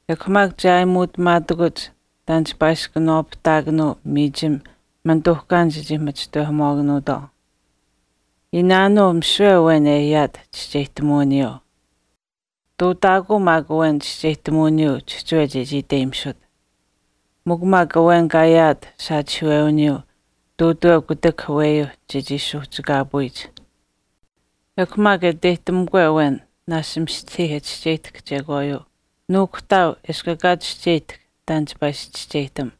Ekw maak che aayimuutamaatakuch taan chipaa ishi kanawaapahtaakanuu miichim manituuhkaanich e chii pachishtinamuwaakanuutwaau. Iinaanuu misiwe awen e ayaat chischeyihtamuwiniyuu. Ihtuutaakuu maak awen chischeyihtamuwiniyuu chihchiwe chechii iteyimisut. Mikw maak awen kaa ayaat saachihiiwewiniyuu ihtuutuweu kutak aweyuuh chechii suuhchikaapuyich. Ekw maak e iteyihtamukwe awen naashch mistahii e chischeyihtahk chekwaayuu, nuukuhtaau eshkw ekaa chischeyihtahk taan chipaa ishi chischeyihtam.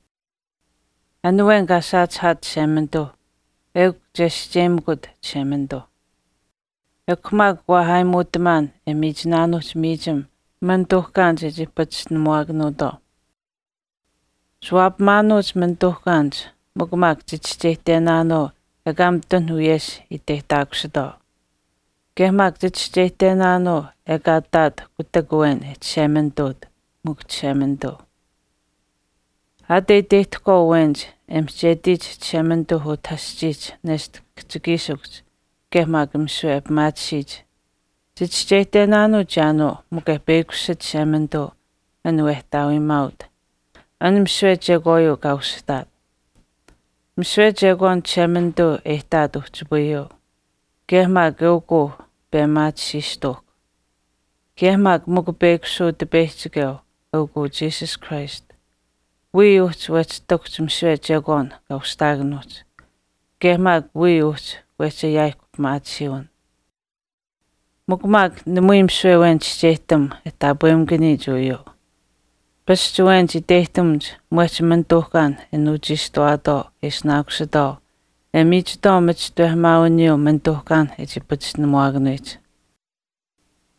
An awen kaa saachihaat Chishemanituu eukw uu chescheyimikut Chishemanituu. Ekw maak waa aayimuutamaan e miichinaanuuhch miichim manituuhkaanich e chii pachishtinamuwaakanuutwaau. Chiwaapamaanuuch manituuhkaanich mikw maak chichischeyihtenaanuu ekaa mitun wiyesh iteyihtaakusitwaau. Kaye maak chichischeyihtenaanuu ekaa ihtaat kutak awen e Chishemanituut, mikw Chishemanituu. Aat e iteyihtahkwaau awenich e mihchetiyich Chishemanituuh utah aschiihch neshta kihchikiishikuhch kaye maak misiwe e pimaatisiyich, chichischeyihtenaanuu wii chiyaanuu mikw e peyakushit Chishemanituu an wehtaawiimaaut, an misiwe chekwaayuu kaa usihtaat. Misiwe chekwaan Chishemanituu e ihtaat uhchipayuu, kaye maak eukuu pemaatisiistuuhkw. Kaye maak mikw peyakushuu Utipeyihchikeu, eukuu Jesus Christ. Wiya uhchi wehchii ihtakuhch misiwe chekwaan kaa ushihtaakanuuhch, kaye maak wiya uhchi wehchi ayaayihkw pimaatisiiwin. Mikw maak namui misiwe awen chischeyihtam e taapwemakaniyich uyuu. Pasch awenich iteyihtamuch mwehch manituuhkaanh e nuuchiishtuwaatwaau e ishinaakusitwaau e miichitwaau machishtawehamaawiniyuu manituuhkaanh e chii pachishtinamuwaakanuyich.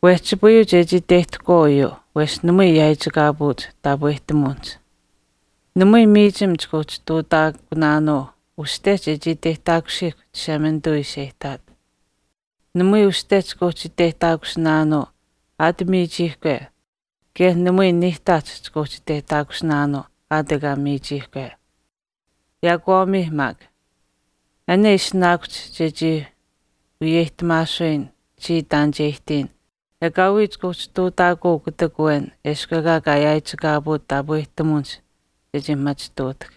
Wehchipayuu chechii iteyihtahkwaau uyuu wesh namui yaaichikaapuuch taapwehtamuwinihch. Namui miichim chika uhchi ihtuutaakunaanuu uste chechii iteyihtaakusiihkw Chishemanituu ishi e ihtaat. Namui uste chika uhchi iteyihtaakusinaanuu aat miichiihkwe kaye namui niihtaach chika uhchi iteyihtaakusinaanuu aat ekaa miichiihkwe. Yaakwaamiih maak. An e ishinaakuhch chechii wiyeyihtamaasuyin chiya taan che ihtiyin ekaawii chika uhchi ihtuutaakuu kutak awen eshkw ekaa kaa yaaichikaapuut taapwehtamuwinihch chechii machituutahkw.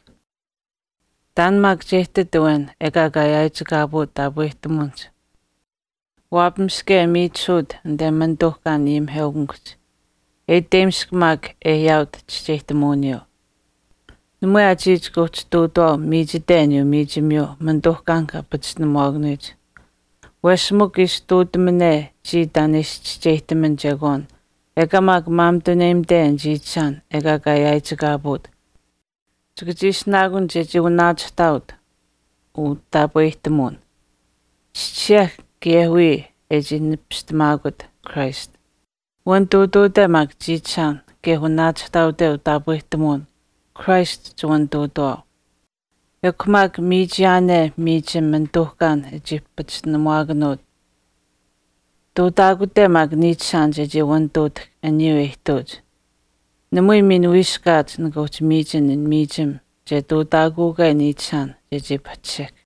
Taan maak che ihtit awen ekaa kaa yaaichikaapuut taapwehtamuwinihch waapamiske e miichisuut anite manituuhkaan ayimiheukamikuhch, e iteyimisk maak e ayaawat chischeyihtamuwiniyuu. Namui aa chiya chika uhchi ihtuutuwaau miichite aniyuu miichimiyuu maanituuhkaanh kaa pachishtinamuwaakanuyich. Wesh mikw ishi ihtuutamane chiya taan e ishi chischeyihtaman chekwaan ekaa maak maamituneyimate an chiichishaan ekaa kaa yaaichikaapuut, chika chii ishinaakun chechii wanaachihtaawat utaapwehtamuwin. Chischisih maa kaye wiya e chii nipistamaakut Christ. Wanituutuute maak chiichishaan kaye wanaachihtaawate utaapwehtamuwin Christ chiwanituutuwaau. Ekw maak, miichiyaane miichim manituuhkaan e chii pachishtinamuwaakanuut ihtuutaakute maak niichishaan chechii wanituutahkw aniyuu e ihtuuch, namui miin wiiskaat nika uhchi miichin an miichim che ihtuutaakuukwe niichishaan chechii pahchishihk.